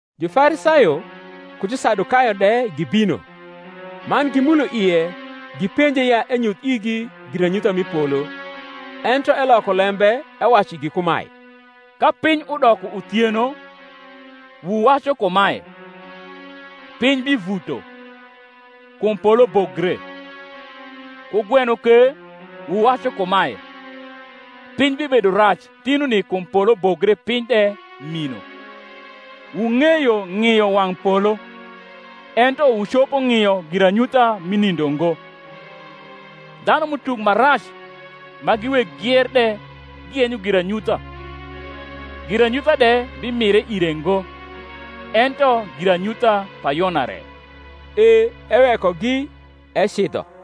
Jufarisayo ku Jusadukayo de gibino, man gimulo ie gipenje ya enyuth igi giranyutha m’i polo. Ento eloko lembe ewacu igi kumae, Ka piny udoko uthieno, wuwacu kumae, Piny bivuto: kum polo bogre. Kugweno ke wuwacu kumae, Piny bibedo rac tinuni kum polo bogre piny de mino. Wung’eyo ng’io wang’ polo; ento wucopo ng’io giranyutha mi nindo ngo. Dhanum’utuk ma rac ma gi weg gier de giyenyo giranyutha; giranyutha de bimire ire ngo, ento giranyutha pa Yona re. E ewekogi, ecidho.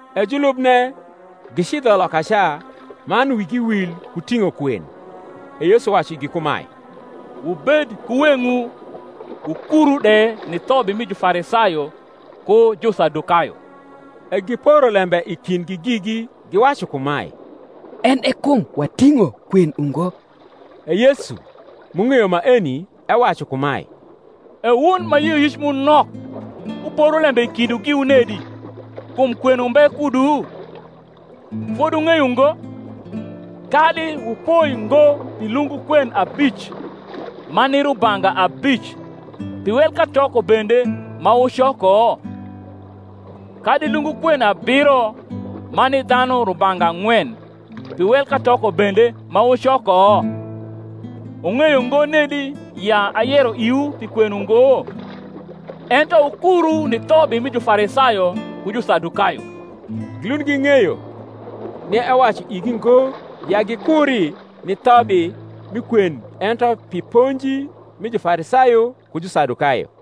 E julubne gicidho lokaca man wigi wil ku ting’o kwen. E Yesu wacu igi kumae, Wubed ku weng’wu wukuru de ni thobi mi Jufarisayo ku Jusadukayo. E giporo lembe i kindgi gigi, giwacu kumae, En e kum wating’o kwen ungo. E Yesu m’ung’eyo maeni ewacu kumae, E wun ma yioyic mu nok wuporo lembe i kindwu giwu nedi, kum kwen umbe kudu? Fodi wung’eyo ngo, kadi wupoi ngo pi lungu kwen abic ma ni rubanga abic, pi wel katoko bende ma wucoko? Kadi lungu kwen abiro ma ni dhanu rubanga ang’wen, pi wel katoko bende ma wucoko? Wung’eyo ngo nedi ya ayero iwu pi kwen ungo? Ento wukuru ni thobi rni Jufarisayo ku Jusadukayo. Gilund ging’eyo nia ewacu igi ngo ya gikuri ni thobi mi kwen ento pi ponji mi Jufarisayo ku Jusadukayo.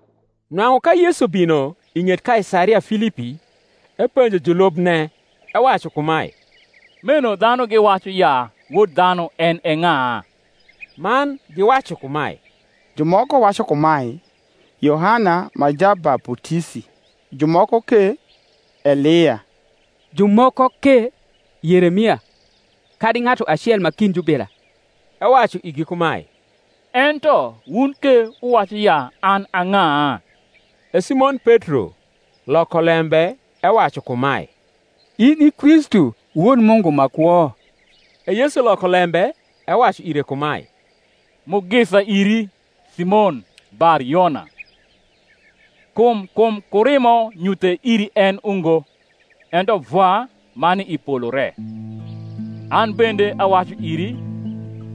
Nwang’u ka Yesu bino i ng’et Kaisaria Filipi, epenjo julubne, ewacu kumae, Meno dhanu giwacu ya Wod dhanu en e ng’a? Man giwacu kumae, Jumoko wacu kumae, Yohana ma Jabaputisi; jumoko ke, Elia; jumoko ke, Yerernia, kadi ng’atu acel ma kind jubila. Ewacu igi kumae, Ento wun ke wuwacu ya an a ng’a? E Simon Petro loko lembe ewacu kumae, In i Kristu, Wod Mungu ma kwo. E Yesu loko lembe ewacu ire kumae, Mugisa iri, Simon BarYona: kum kum ku rimo nyuthe iri en ungo, ento Vwa ma ni i polo re. An bende awacu iri,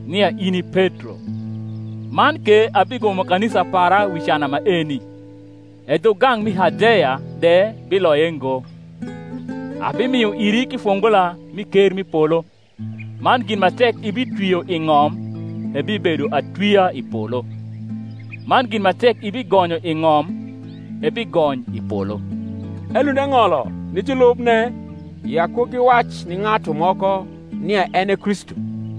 nia in i Petro, man ke abigomo kanisa para wi cana maeni; e dhugang’ mi Hadeya de hiloye ngo. Abimio iri kifungula mi ker m’i polo: man gin ma tek ibitwio i ng’om ebibedo atwia i polo; man gin ma tek ibigonyo i ng’om ebigony i polo. Elund eng’olo ni julubne ya ku giwac ni ug’atu moko nia en e Kristu.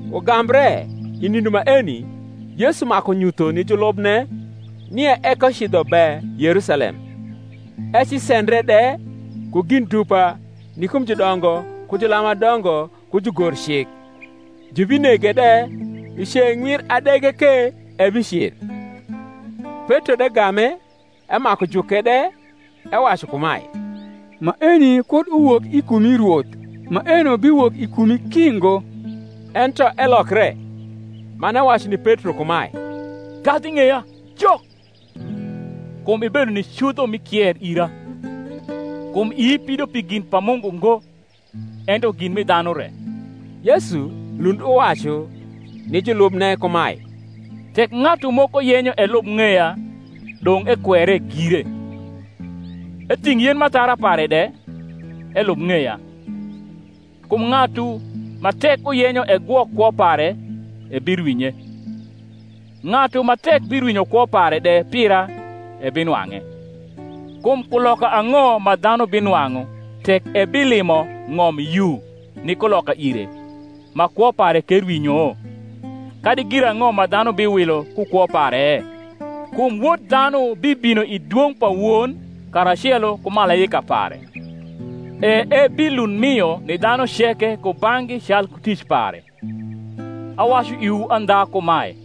Ugambre i nindo maeni Yesu maku nyutho ni julubne, nia ekocidho be Yerusalem, ecisendre de ku gin dupa ni kum judongo ku julam ma dongo ku jugorcik, jubinege de, i ceng’ mir adege ke ebicer. Petro de game, emaku juke de, ewacu kumae, Maeni kud uwok i kumi, Rwoth: maeno biwok i kumi ki ngo. Ento elokre, man ewacu ni Petro kumae, Kadh i ng’eya, Jok: kum ibedo ni cudho mi kier ira: kum ii pido pi gin pa Mungu ngo, ento gin mi dhanu re. Yesu lund uwacu ni julubne kumae, Tek ng’atu moko yenyo elub ng’eya, dong’ ekwere gire, eting’ yen m’athara pare de, elub ng’eya. Kum ng’atu ma tek uyenyo egwok kwo pare ebirwinye: ng’atu ma tek birwinyo kwo pare de pira ebinwang’e. Kum kuloka ang’o ma dhanu binwang’u tek ebilimo ng’om yu ni kuloka ire, ma kwo pare ke rwinyo? kadi girang’o ma dhanu biwilo ku kwo pare? Kum Wod dhanu bibino i dwong’ pa Won karacelo ku malaika pare; e ebilund mio ni dhanu ceke kubang’gi calku tic pare. Awacu iwu andha kumae,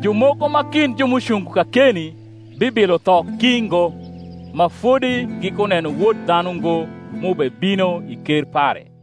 Jumoko ma kind ju m’ucungo kakeni bibilo tho ki ngo, ma fodi gikuneno Wod dhanu ngo m’ubebino i ker pare.